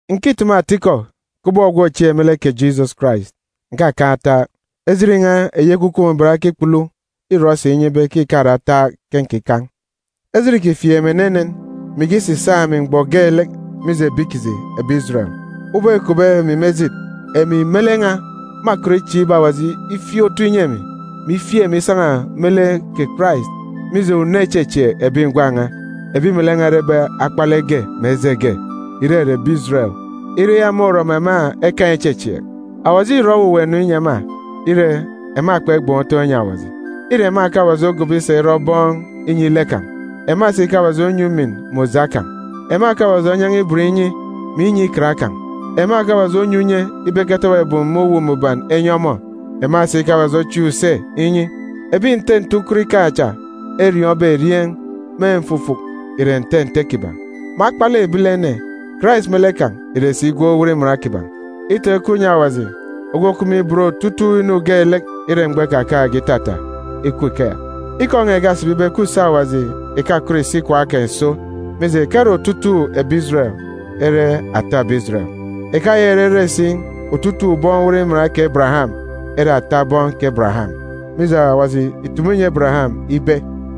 Ǹkitumu atikọ kubọk ogwu òchieek me lek kè Jisọs Karais, ǹkakan̄ ataak, ejit n̄a, eyi Ekwukwu Mbuban okikpulu, îrọ si inye ibe ke ìkare ataak ke nkikan̄. Ejit îkifieek emi enenen, mè ikisisaak emi mgbọ geelek, mije ebi kiji, ebi Ijeren. Ubọk îkupbe emi me ejit, emi me lek n̄a mâkọt ichieek ibe Awaji ifieek otu inyi emi, mè ifieek emi isan̄a me lek kè Karais, mije una ichechieek ebi ngwan̄ n̄a, ebi melek n̄a erebe akpalek ge mè eje ge, ìrere ebi Ijeren, ire eya môrọ mè ema ekaan̄ ichechieek. Awaji îrọ owuwa inu inyi ema, ire, ema kpegban̄ utọn̄ inyi Awaji. Îre ema ke Awaji ogobo isa irọ bọn inyi lek kan̄, ema si ke Awaji onyi ujamgbugbo kan̄. Ema ke Awaji onyan̄a ibot inyi, mè inyi Ikan kan̄. Ema ke Awaji onyi unye ibe eketọbọ ebum me Uwu Mbuban enyi ọmọ, ema si ke Awaji ochieek use inyi. Ebi nte nte ukot ikaan̄ cha eriọọn̄be erieen̄ me mfufuk ìre nte nte kiban̄. Me akpalek ebilene, Karais me lek kan̄ ìre si gwun̄ owot iman kiban̄. Itọn̄ ikup inyi Awaji ogwu òkup me ibot otutuuk inu geelek ire mgbọ ikakaan̄ge itata. Ikup ikeya! Ikọ n̄a ìkasibi ibe ke use Awaji ìkakọt ìsi ikwaan̄ kan̄ ìso, mije, ìkare otutuuk ebi Ijeren ere ata ebi Ijeren. Ìkayaka ìrere si otutuuk bọn owot iman kè Ebereyam ere ata bọn kè Ebereyam, mije, Awaji ìtumu inyi Ebereyam ibe,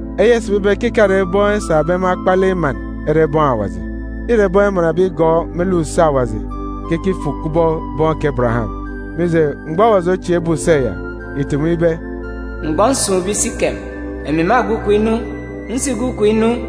Eya ìsibi ibe ke ìkare bọn esabe me akpalek iman ere bọn Awaji. Îre bọn emanbe igọọk me lek use Awaji ke ekifuk kubọk bọn kè Ebereyam. Mije, mgbọ Awaji ochieekbe use ya, ìtumu ibe, “Mgbọ nsun̄be isikem, emi mâgwu ikom inu. Nsigwu ikom inu,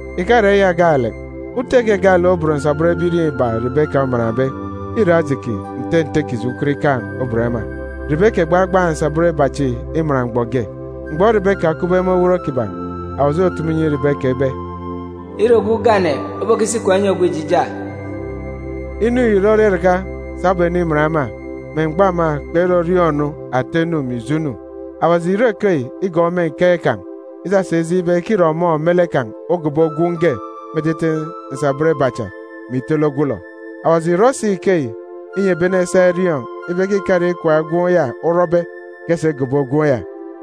Ìkare eya gaalek. Ute ge gaalek obon nsabọn ebirieen̄ iba Ribeka omanbe. Îre Ajiki, nte nte kiji ukot ikaan̄ obon ema. Ribeka ìgbagbaan̄ nsabọn iba chi iman mgban iba. Mgbọ Ribeka okupbe me owot kiban̄, Awaji otutumu inyi Ribeka ibe, “Îre ogwu ugane obokisi ikwaan̄ inyi ogwu ijija!” Inu yi ìrọrọ iraka sabum eniman ema, me mgbọ ema kperọriọọn̄-nu ata inu mè ijo inu. Awaji ìrọ ikeyi igọọk me nkeek kan̄ isasa ijeen̄ ibe ke îre ọmọ me lek kan̄ ogobo gwun̄ ge me etete nsabọn iba cha, mè itele ogwulọ. Awaji ìrọ si ikeyi inyi ebi ene esa eriọọn̄ ibe ke ìkare ikwaan̄ gwun̄ ya orọbe ke esa igobo gwun̄ ya;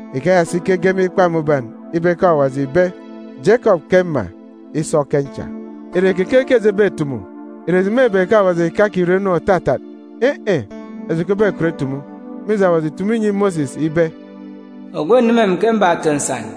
Ikeya si ke ege me Ikpa Mbuban ibe ke Awaji ìbe, “Jekọp ke mma, Ìre keke ke eji ebetumu? Ìre eji mêbe ke Awaji ìkakirọ inu òtatat? In̄-in̄, eji kpebekọt itumu! Mije, Awaji ìtumu inyi Mosis ibe, “Ogwu òneme emi ke mbato nsan;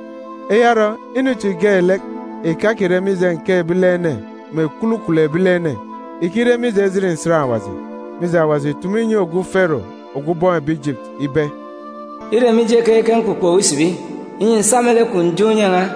Eya orọ, inu chi geelek ìkakire mije nkeek ebilene mè kwulukwulu ebilene, ìkire mije ejit nsan Awaji. Mije, Awaji ìtumu inyi ogwu Fero, ogwu ubọọn̄ ebi Ijipiti, ibe, “Îre mije keyi ke mkpukpo owu isibi, inyi ǹsa me lek kwun̄ ǹjeen̄ unye n̄a,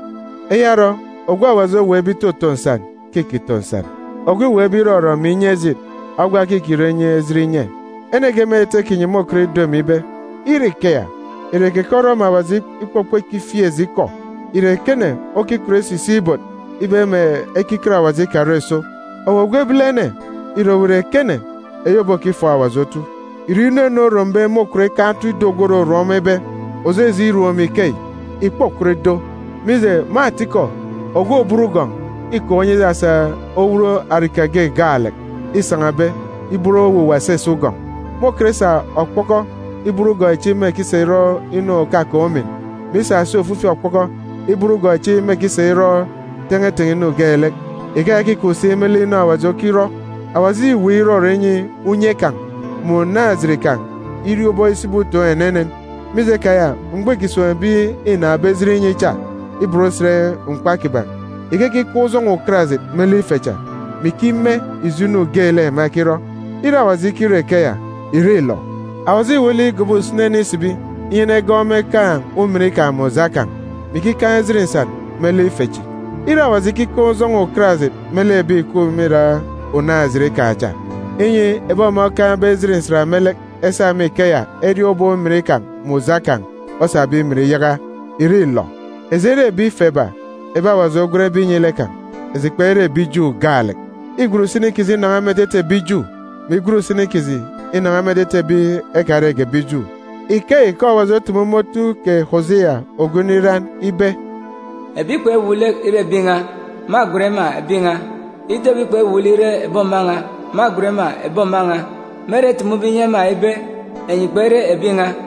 Eya orọ, ogwu Awaji oweekbe itoto nsan ke îkito nsan, ogwu îweekbe irọrọ mè inye ejit, ogwa ke îkirọ inyi ejit inye. Ene ge me etete kinyi môkọt ido emi ibe, “Ire ikeya, ìre keke orọ mè Awaji ikpọkpọ ikifieek eji ikọ? Ìre ekene okikọt isisik ibot ibe mè ekiket Awaji ikarọ ìso?” Owu ogwu ebilene, ìre owu ìre ekene, eyi obokifọọk Awaji otu? Ìre inu ene orombe môkọt ikaan̄ otu ido ogwu òrorom ọmọ ibe, “Òjeje irom emi ikeyi?”g Ìkpokọt ido! Mije, me atikọ, ogwu òbot ugọn̄ îkaan̄ unye isasa owut arika ge gaalek îsan̄abe ibot owuwa esese ugọn̄. Môkọt isa okpọkọ ibot ugọn̄ echi mêkisa irọ inu òkakaan̄ umin, mè isa si ofifi okpọkọ ibot ugọn̄ echi mêkisa irọ ten̄eten̄e inu geelek. Ikeya ke îkup si me lek inu Awaji okirọ. Awaji îweek irọrọ inyi unye kan̄ mè unaan̄-ejit kan̄ iriọọn̄ ubọk isibi utoon̄ enenen. Mije keya, mgbọ îkisun̄ ebi înaan̄be ejit inyi cha iban usen mkpa kiban̄, ikekikaan̄ ujọn̄ọ ukarajit me lek ife cha, mè ikime ijo inu geelek ema ekirọ. Ire Awaji ikirọ ikeya, ìre îlọ? Awaji îwuuk lek igobo usini ene isibi inyi enegọọk ọmọ ekaan̄ ujamgbugbo kan̄, mè ikikaan̄ ejit nsan me lek ife chi. Ire Awaji ikikaan̄ ujọn̄ọ ukarajit me lek ebi ìkup me irak unaan̄-ejit kan̄ cha, inyi ebi ọmọ okaan̄be ejit nsan me lek esa me ikeya eriọọn̄ ubọk ujamgbugbo kan̄ osabe imin iyaka, ìre îlọ? Eji ere ebi ife ba, ebi Awaji ogwenbe inyi lek kan̄. Eji kpere ebi Ju gaalek. Îgwen usini kiji inan̄a me etete ebi Ju, mè igwen usini kiji inan̄a me etete ebi ekarege ebi Ju. Ikeyi ke Awaji otumu me otu kè Osia ogwu nriran ibe, “Ebi kpewuuk lek ire ebi n̄a, mâgwen ema ‘Ebi n̄a.’ Ido ebi kpewuuk lek ire ebi òma n̄a, Me ere etumube inyi ema ibe, ‘Enyi kpere ebi n̄a,’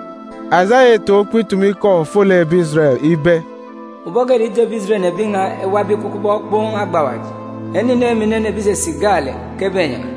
Asaya îtaan̄ ukpo itumu ikọ ofolek ebi Ijeren ibe, “Ubọk geelek ido ebi Ijeren ebi n̄a ewabe ikup kubọk okpoon̄ agba awaji, ene inen mè inen ebi ìsisik gaalek ke ebenyan̄a.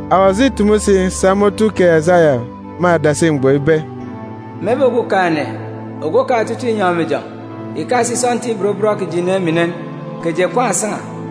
Awaji îtumu si sa me otu kè Asaya me adasi mgbọ ibe, “Mebe Okumugwem Ogwukaan̄ Inyọn̄ mè Ijọn̄ ìkasik sọntiik ibot bọn kiji inen mè inen, kè eji èkwaan̄ èsan̄a,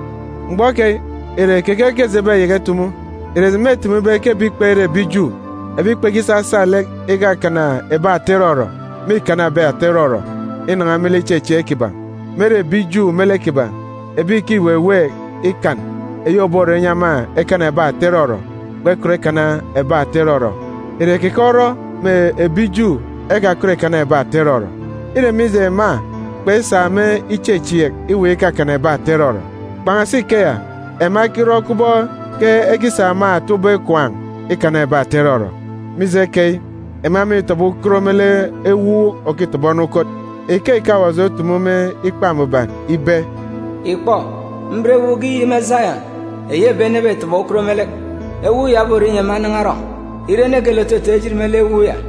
Mgbọ keyi, ìre keke ke eji ebeyaka itumu? Ikọ eji ekitumu ìsibi ibe ke ebi kpere ebi Ju, ebi kpekisasa lek ikakana ebi ata irọrọ, mîkana ebi ata irọrọ inan̄a me lek ichechieek kiban̄. Ire, ebi Ju me lek kiban̄, ebi ìkiweweek ikan eyi òborọ inyi ema ekana ebi ata irọrọ, kpekọt ikana ebi ata irọrọ. Ìre keke orọ mè ebi Ju ekakọt ìkana ebi ata irọrọ? Îre mije ema kpesa me ichechieek iweek ikakana ebi ata irọrọ. Kpan̄asi ikeya, ema ekirọ kubọk ke ekisa me ata ubọk ikwaan̄ ikana ebi ata irọrọ. Mije keyi, ema mîtọbọ ukot me lek “ewuuk òkitọbọ ene ukot.” Ikeyi ke Awaji otumu me Ikpa Mbuban ibe, “Ìkpọ, mben ewuuk ge iyik me Sayọn, eyi ebi ene ebetọbọ ukot me lek; ewuuk ya oborọ inyi ema enan̄a erọn̄. Ire, ene geelek òtotoon̄ ejit me lek ewuuk ya,